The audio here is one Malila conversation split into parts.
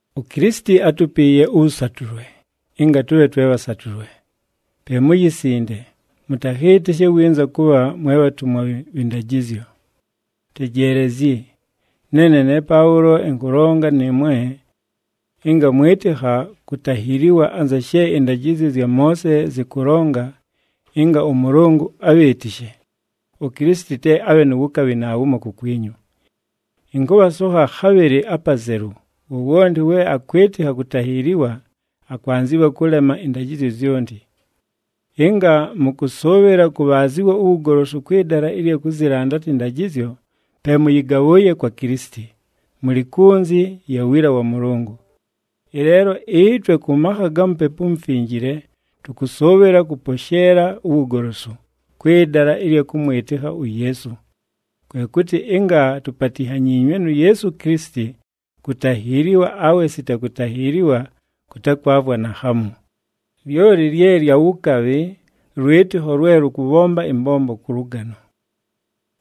UKilisiti átupiiye ʉwʉsatʉlwe, ɨnga tʉbhe twe bhasatʉle. Pe muyisinde, mʉtakhɨɨtɨshe winza kʉbha mwe bhatumwa bhɨ ndajɨzyo. Tejeelezyi! Neene ne Paʉlo ɨnkʉlonga nɨɨmwe! Ɨnga mwɨtɨkha kutahiiliwa anza she ɨndajɨzyo zya Moose zɨkʉlonga ɨnga ʉMʉlʉngʉ abhɨɨtɨshe, uKilisiti te abhe nu wukabhi naawumo kukwinyu. Ɨnkʉbhasokha khabhɨlɨ apazelu, wowonti we akwɨtɨkha kutahiiliwa, akwanzɨwa kʉlema ɨndajɨzyo zyonti. Ɨnga mʉkʉsʉʉbhɨla kʉbhaazɨwa uwugolosu kwɨ dala ɨlya kʉzɨlandata ɨndajɨzyo, pe mʉyɨgabhʉʉye kwa Kilisiti, mʉlɨ kunzi ya wiila wa Mʉlʉngʉ. Ɨleelo ɨtwe, kʉ makha ga Mupepu uMufinjile tʉkʉsʉʉbhɨla kʉposheela uwugolosu, kwɨ dala ɨlya kʉmwɨtɨkha uYeesu. Kwe kʉtɨ ɨnga tupatinhanyiinywe nu Yeesu Kilisiti, kutahiiliwa awe sita kutahiiliwa kʉtakwavwa naakhamu, lyoli lye lya wukabhi, lwɨtɨkho lwe lʉkʉbhomba ɨmbombo kʉ lʉgano.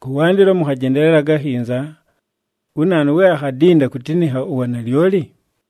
Kʉwandɨlo mʉkhajendelelaga akhinza! Wu naanu, we akhadinda kutinikha uwanalyoli?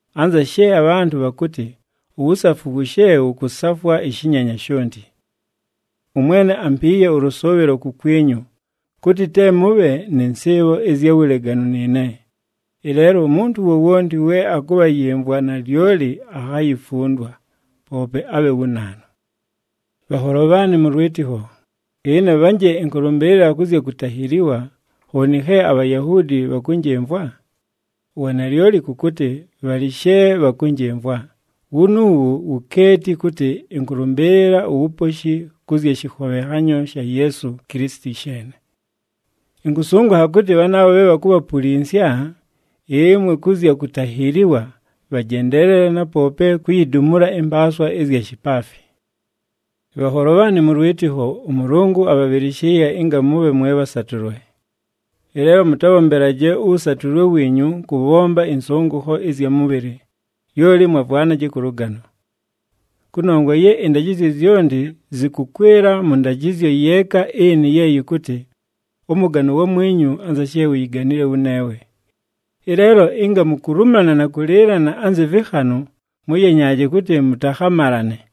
Anza she abhantʉ bhakʉtɨ, “Uwusafu wushe wʉkʉsafwa ɨshɨnyenya shonti!” ɄMwene ampiiye ʉlʉsʉʉbhɨlo kukwinyu, kʉtɨ te mʉbhe nɨ nsɨɨbho ɨzya wuleganu nɨɨne. Ɨleelo umuntu wowonti we akʉbhayɨmvwa nalyoli akhayifundwa, poope abhe wu naanu. Bhanholo bhaanɨ mʉ lwɨtɨkho, ɨne bhanje ɨnkʉlʉmbɨɨlɨla kʉ zya kutahiiliwa, khooni khe aBhayahuudi bhakʉnjɨmvwa? Uwanalyoli kʉ kʉtɨ bhalɨ she bhakʉnjɨmvwa, wunuuwu wukeeti kʉtɨ ɨnkʉlʉmbɨɨlɨla uwuposhi kʉ zya shɨkhobhenhanyo sha Yeesu Kilisiti sheene. Ɨnkʉsʉngʉkha kʉtɨ bhanaabho bhe bhakubhapulinsya ɨmwe kʉ zya kutahiiliwa, bhajendeelele na poope kuyidumula ɨmpaaswa ɨzya shipaafi! Bhanholo bhaanɨ mʉ lwɨtɨkho, ʉMʉlʉngʉ abhabhɨlɨshɨɨye ɨnga mʉbhe mwe bhasatʉlwe. Ɨleelo mʉtabhombelaje ʉwʉsatʉlwe wiinyu kʉbhomba ɨnsʉngʉkho ɨzya mʉbhɨlɨ, lyoli mwavwanaje kʉ lʉgano. Kʉnongwa ye ɨndajɨzyo zyonti zɨkʉkwɨla mʉ ndajɨzyo yeeka ɨnɨ ye yɨkʉtɨ, “Ʉmʉgane uwamwinyu anza she uyiganile wʉneewe.” Ɨleelo ɨnga mukulumana na kʉlɨɨlana anzɨ vɨkhanʉ, mʉyenyaaje kʉtɨ mʉtakhamalane.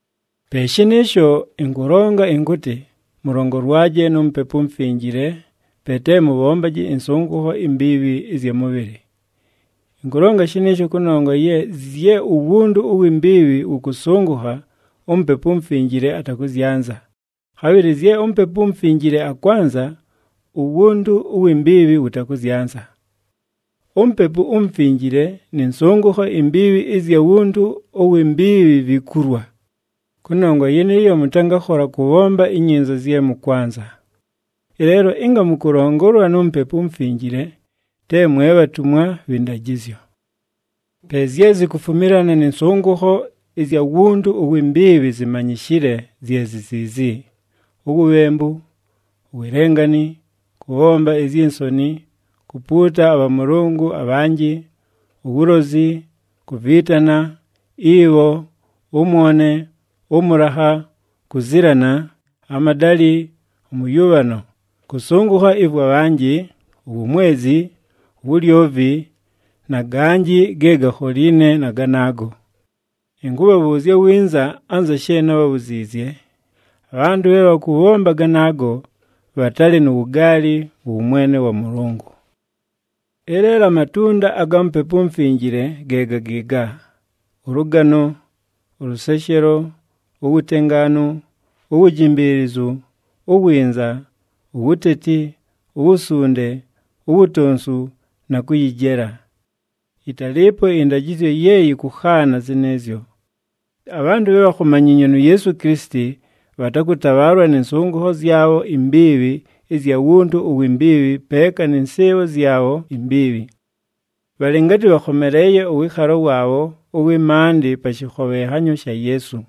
Pe shɨnɨɨsho, ɨnkʉlonga ɨnkʉtɨ, mʉlongolwaje nu Mupepu uMufinjile, pe te mʉbhombaje ɨnsʉngʉkho imbiibhi ɨzya mʉbhɨlɨ. Ɨnkʉlonga shɨnɨɨsho, kʉnongwa ye zye uwuntu uwi mbiibhi wʉkʉsʉngʉkha, uMupepu uMufinjile atakʉzyanza, khabhɨlɨ zye uMupepu uMufinjile akwanza, uwuntu uwi mbiibhi wʉtakʉzyanza. UMupepu uMufinjile nɨ nsʉngʉkho imbiibhi ɨzya wuntu uwi mbiibhi vikulwa. Kʉnongwa yɨnɨɨyo, mʉtangakhola kʉbhomba inyinza zye mʉkwanza. Ɨleelo ɨnga mʉkʉlongolwa nu Mupepu uMufinjile, te mwe bhatumwa bhɨ ndajɨzyo. Pe zye zikufumilana nɨ nsʉngʉkho ɨzya wuntu uwi mbiibhi zimanyishile, zye zi ziizi: uwubhembu, uwelengani, kʉbhomba izyi nsoni, kupuuta abhamʉlʉngʉ abhanjɨ, uwulozi, kuviitana, ibho, ʉmwone, ʉmʉlakha, kuzilana, amadalɨ, ʉmʉyʉbhano, kʉsʉngʉkha ɨvwa bhanjɨ, uwumwezi, uwulyovi, na ganjɨ ge gakholiine na ganaago. Ɨnkʉbhabhʉʉzya winza anza she nábhabhuziizye, abhantʉ bhe bhakʉbhomba ganaago, bhatalɨ nu wugaali mʉ wʉmwene wa Mʉlʉngʉ. Ɨleelo amatunda aga Mupepu uMufinjile, ge ga gɨɨga: ʉlʉgano, ʉlʉseshelo, uwutengaanu, uwujimbiilizu, uwinza, uwuteti, uwusunde, uwutonsu na kʉyɨjela. Yɨtalɨɨpo ɨndajɨzyo ye yɨkʉkhaana zɨnɨɨzyo. Abhantʉ bhe bhakhomanyiinywe nu Yeesu Kilisiti, bhatakʉtabhaalwa nɨ nsʉngʉkho zyabho imbiibhi ɨzya wuntu uwi mbiibhi peeka nɨ nsɨɨbho zyabho imbiibhi. Bhalɨ ngatɨ bhakhomeleeye ʉwɨɨkhalo waabho ʉwɨ maandɨ pa shɨkhobhenhanyo sha Yeesu.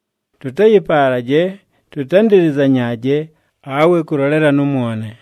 Tʉtayɨpaalaje, tʉtandɨlɨzanyaaje, awe kʉlolelana ʉmwone.